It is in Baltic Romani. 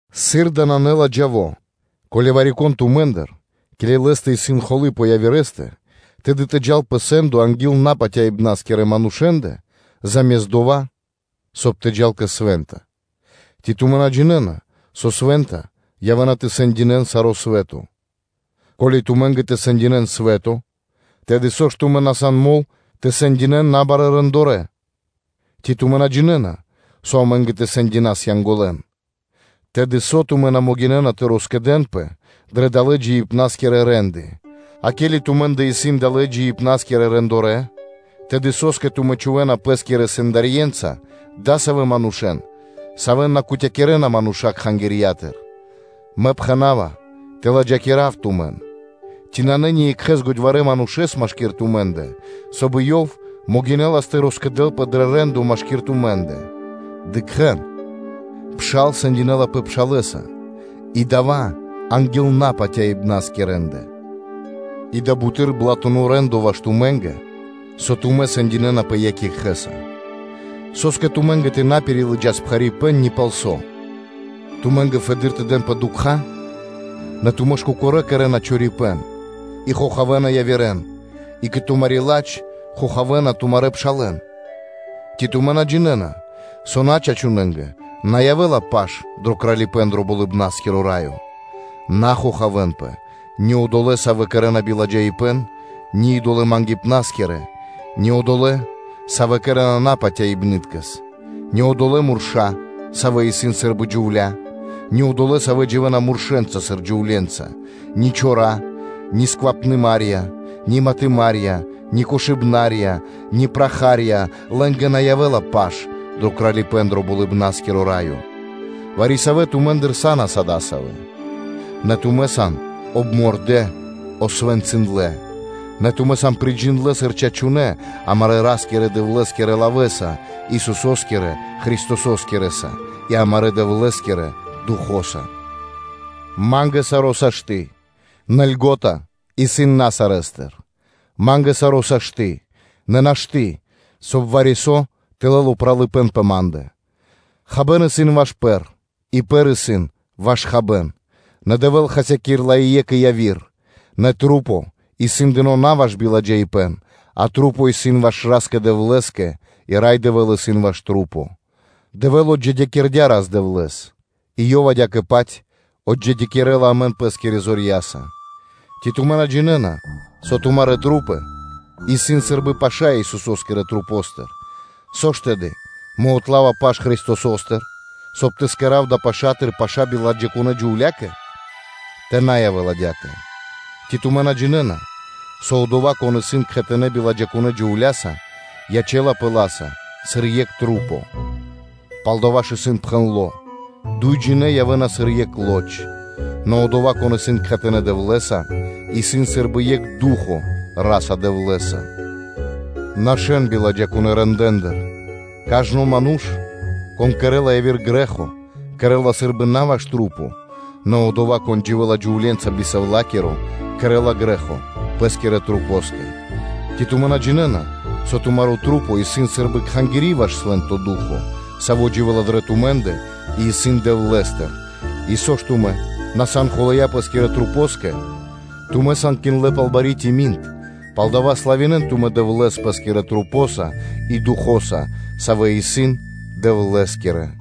Сыр дава́ нанэ ладжаво, ко́ли вари-кон тумэ́ндыр, ке́ли лэ́стэ исын холы́ пэ явирэ́стэ, тэды тэ джал пэ сэ́ндо анги́л напатяибнаскирэ манушэ́ндэ (Наюдэ́ндэ), заме́ст дова́, соб (кай) тэ джал кэ свэ́нта? Ци тумэ́ на джинэ́на, со свэ́нта явэ́на тэ сэндинэ́н саро́ свэ́то? Ко́ли тумэ́нгэ тэ сэндинэ́н свэ́то, тэды со ж тумэ́ на сан мол, соб (кай) тэ сэндинэ́н набарэ́ рэндорэ́ (де́лыцы)? Ци тумэ́ на джинэ́на, со амэ́нгэ тэ сэндинас Янголэн? Тэды со тумэ́ на могинэ́на тэ роскэдэнпэ дрэ далэ́ джиибна́скирэ рэ́нды? А ке́ли тумэ́ндэ исын далэ́ джиибна́скирэ рэндорэ́, тэды со́скэ тумэ́ чхувэ́на пэ́скирэ сэндарьенца дасавэ́ манушэ́н, савэ́н на кутякирэна мануша́ кхангирья́тыр. Мэ пхэна́ва тэ ладжакирав тумэн. Ци нанэ ниекхэс годьварэ́ манушэ́с машки́р тумэ́ндэ, соб (кай) ёв могинэлас тэ роскэдэлпэ дро рэ́ндо машки́р тумэ́ндэ? Дыкхэ́н: пшал сэндинэлапэ пшалэса, и дава́ исын анги́л напатяибнаскирэндэ! И дава́ исын буты́р блатуно рэ́ндо ваш тумэ́нгэ, со тумэ́ сэндинэнапэ екх екхэ́са. Со́скэ тумэ́нгэ тэ на пирилыджас пхарипэ́н ни пал со? Тумэ́нгэ фэды́р тэ дэнпэ дукха́? Нэ тумэ́ ж кокорэ́ кэрэ́на чорипэ́н и хохавэна явирэ́н, и кэ тумари́ ладж, хохавэна тумарэ́ пшалэ́н. Ци тумэ́ на джинэ́на, со начачунэнгэ на явэ́ла паш дро Кралипэ́н дро Болыбна́скиро Раё? На хохавэнпэ: ни одолэ́, савэ́ кэрэ́на блэ́ндо, ни идолэ-мангипнаскирэ, ни одолэ́, савэ́ кэрэ́на марки, ни одолэ́ мурша́, савэ́ исын сы́рбы джувля́, ни одолэ́, савэ́ дживэ́на муршэнца сыр джувле́нца, ни чора́, ни сквапныма́рья, ни матыма́рья, ни кошыбна́рья, ни праха́рья-лэ́нгэ на явэ́ла паш дро Кралипэ́н дро Болыбна́скиро Раё. Вари-савэ́ тумэ́ндыр са́нас адасавэ́. Нэ тумэ́ сан обмордэ, освэнцындлэ, нэ тумэ́ сан приджиндлэ сыр чачунэ́ амарэ́ Ра́скирэ-Дэвлэ́скирэ лавэ́са, Исусо́скирэ Христососкирэса и амарэ́ Дэвлэ́скирэ Духо́са. Ма́нгэ саро́ сашты́, нэ льго́та (польза) исын на сарэ́стыр; ма́нгэ саро́ сашты́, нэ нашты́, соб (кай) вари-со тэ лэл упралыпэ́н пэ ма́ндэ. Хабэ́н исын ваш пэр, и пэр исын ваш хабэ́н, нэ Дэвэ́л хасякирэ́ла и екх, и яви́р: нэ маса́ исын дынэ́ на ваш биладжаипэ́н, а маса́ исын дынэ́ ваш Ра́скэ-Дэвлэ́скэ и Рай Дэвэ́л исын ваш маса́. Дэвэ́л отджидякирдя́ Рас-Дэвлэ́с, и Ёв адя́кэ-паць отджидякирэла амэн Пэ́скирэ зорья́са. Ци тумэ́ на джинэ́на, со тумарэ́ маса́ исын сы́рбы паша́ Исусо́скирэ масэ́ндыр? Со ж, тэды, мэ отлава паш Христосостыр, соб (кай) тэ кэра́в далэ́ пашатыр паша́ биладжакунэ́ джувля́кэ? Тэ на явэ́л адя́кэ. Ци тумэ́ на джинэ́на, со одова́, кон исын кхэтанэ́ биладжакунэ́ джувля́са, ячэ́лапэ ла́са сыр екх маса́? Палдава́ ж, исын пхэндло́: “Дуйджинэ́ явэ́на сыр екх лоч.” Нэ одова́, кон исын кхэтанэ́ Дэвлэ́са, исын сы́рбы дро екх ду́хо (фа́но) Ра́са-Дэвлэ́са. Нашэ́н биладжакунэ́ рэндэ́ндыр. Кажно ману́ш, кон кэрэ́ла яви́р грэ́хо, кэрэ́ла сы́рбы на ваш пэ́скэ, нэ одова́, кон дживэ́ла джувле́нца би сэвлакиро, кэрэ́ла грэ́хо пэ́скирэ масэнгэ. Ци тумэ́ на джинэ́на, со тумарэ́ маса́ исын сы́рбы кхангири́ ваш Свэ́нто Ду́хо (Фа́но), Саво́ дживэ́ла дрэ тумэ́ндэ и исын Дэвлэ́стыр; и со ж тумэ́ на сан хулая́ пэ́скирэ масэнгэ? Тумэ́ сан киндлэ пал бари тими́н (кимин); палдава́ славинэ́н тумэ́ Дэвлэ́с пэ́скирэ масэнца и Духо́са, савэ́ исын Дэвлэ́скирэ.